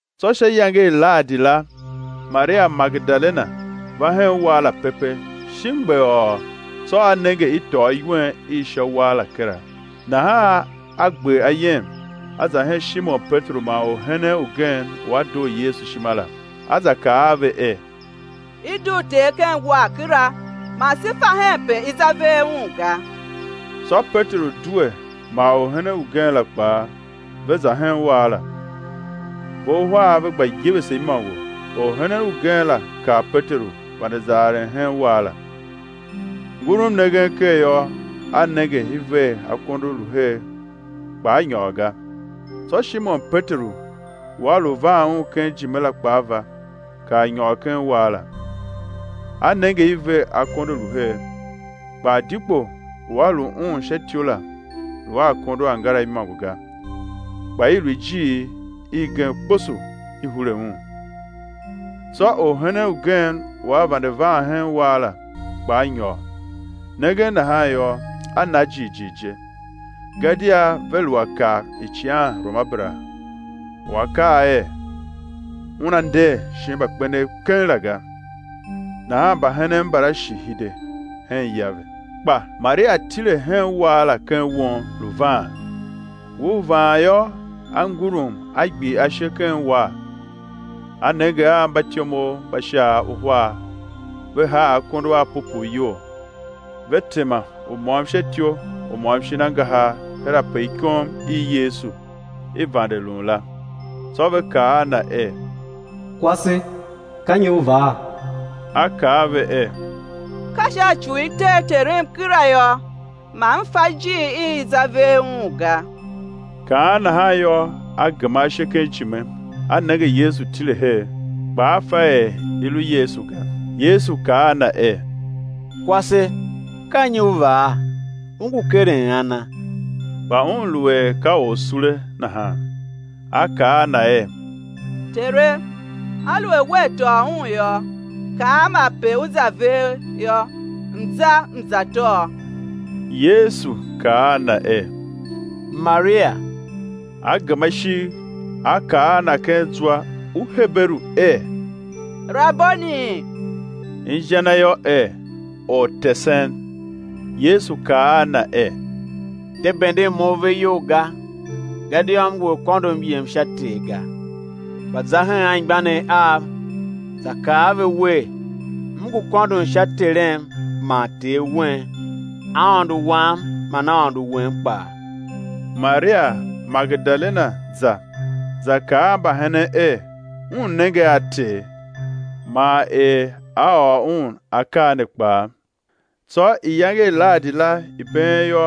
Tsô sha iyange i Lahadi la, Maria Magedalena va hen uwar la pepe, shi mgbeghôô, tsô a nenge i tôô iwen i sha uwar la kera. Nahan a gber ayem, a za hen Shimon Peteru man orhenen ugen u a doo Yesu ishima la, a za kaa a ve er: I dugh Ter ken uwar kera, man se fa henpe i ze ver Un ga. Tsô Peteru due man orhenen ugen la kpaa, ve za hen uwar la. Ve uhar ve gba yevese imôngo; orhenen ugen la kar Peteru, vande za aren hen uwar la. Ngurum nengen ker yô, a nenge i ver akondo lu her kpa a nyôr ga. Tsô Shimon Peteru u a lu van un ken ijime la kpaa va, kar nyôr ken uwar la, a nenge i ver akondo lu her. Kpa adikpo u a lu Un sha ityou la, lu a akondo angara imôngo ga, kpa i lu ijiir igen kposo i hure un. Tsô orhenen ugen u vande van hen uwar la, kpaa nyôr; nengen nahan yô, a na jighjigh je. Gadia ve lu a kav icighanruamabera u a kaa er, Una nder shin mbakpenev keng la ga. Nahan mbahenen mbala shi hide hen ya ve. Kpa Maria tile hen uwar la ken won, lu vaan. Ngur vaan yô, a ngurum a gbir ashe ken uwar, a nenge a mbatyomov mba Shaav uhar ve haa akondo a pupuu iyol, ve tema, u môm sha ityou, u môm shin angahar her ape ikom i Yesu i vande lun la. Tsô ve kaa a na er: Kwase, ka nyi u vaa? a kaa a ve er: Ka sha ci u ve tee Terem kera yô, man m fa ijiir i ve za ver Un la ga. Kaan nahan yô, a gema ashe ken ijime, a nenge Yesu tile her, kpa a fa er i lu Yesu ga. Yesu kaa a na er: Kwase, ka nyi u vaa? U ngu keren ana? Kpa un lu er ka orsule, nahan a kaa a na er: Tere, aluer Wea tôô Un yô, kaam ape U za ver yô, m̱ za m̱ za tôô. Yesu kaa a na er: Maria! A gema ishigh, a kaa a Na ken zwa u Heberu er: Raboni, inja na yô er: Ortesen. Yesu kaa a na er: De benden Mo ave iyol ga, gadia M ngu a kôndo M yem sha Ter ga; kpa za hen anmgbianev Av, za kaa a ve wer: M ngu kôndon sha Terem man Ter wen, Aôndo wam man Aôndo wen kpaa. Maria Magedalena za, za kaa mbahenen er un nenge a Ter, man er A ôr un akaa ne kpaa. Tsô iyange i Lahadi la i been yô,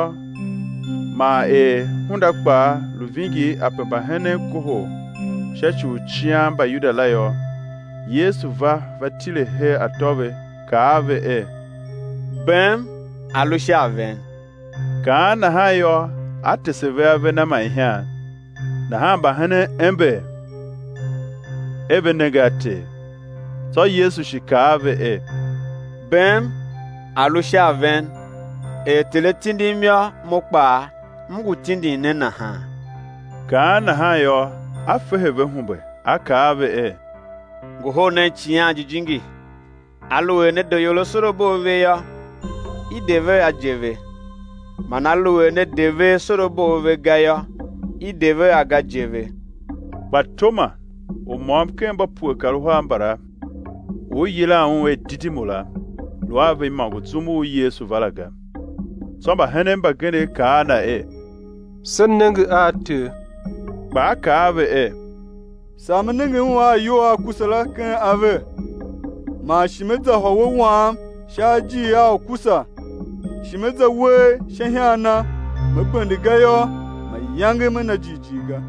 man er hunda kpaa lu vingir ape mbahenen kohol sha ci u cian Mbayuda la yô, Yesu va va tile her atô ve, kaa a ve er: Bem a̱ lu sha a ven. Kaan nahan yô, A tese ve ave Na man ihan. Nahan mbahenen ember er ve nenge a Ter. Tsô Yesu shi kaa a ve er: Bem a̱ lu sha a ven. Er Ter A tindim yô, Mo kpaa M ngu tindin ne nahan. Kaan nahan yô, A fehe ve humbe, A kaa a ve er: Ngohol nen Icighan Jijingi. Aluer ne de ior asorabo a ve yô, i de ve a je ve; man aluer ne de ve asorabo a ve ga yô, i de ve a ga je ve. Kpa Toma, u môm ken mba pue kar uhar mbala, u i yilan un er Didimu la, lu a ve imôngo zum u Yesu va la ga. Tsô mbahenen mbagenev kaa a na er: Se nenge a Ter; kpa a kaa a ve er: Saa me nenge Un a ayol a ukusa la ken ave, man shi me za hôwe wam sha ajiir a ukusa, shi me za uwegh sha ihan Na me bende ga yô, mayange me na jighjigh ga.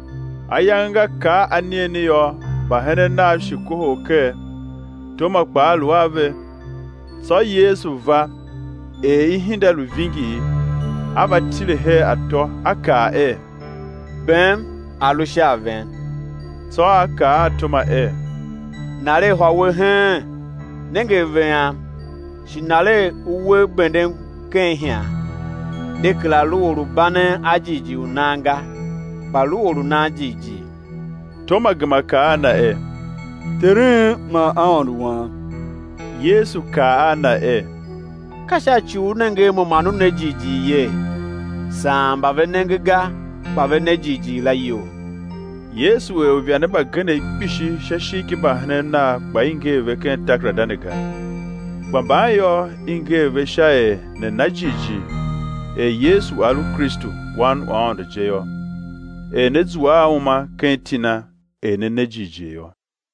Ayange nga kar anigheni yô, mbahenen Nav shi kohol ker, Toma kpaa lu a ve. Tsô Yesu va er ihinda lu vingir, A va tile her atô A kaa er: Bem a̱ lu sha a ven. Tsô A kaa a Toma er: Naregh hôwe heen, nenge ave Am, shi naregh uwegh bendem ken ihan, de kera lu or u banen a jighjigh u nan ga, kpa lu or u nan jighjigh. Toma gema kaa a Na er: Terem man Aôndo Wam. Yesu kaa a na er: Ka sha ci u u nenge a Mo man u ne jighjigh yee? Saan mba ve nenge ga kpa ve ne jighjigh la iyol. Yesu er uivande mbagenev kpishi sha ishigh ki mbahenen Nav kpa i nger ve ken takerada ne ga, kpa mban yô, i nger ve sha er ne̱ na jighjigh er Yesu A lu Kristu, Wan u Aôndo je yô, er ne̱ zua a uma ken iti Na er ne ne jighjigh yô.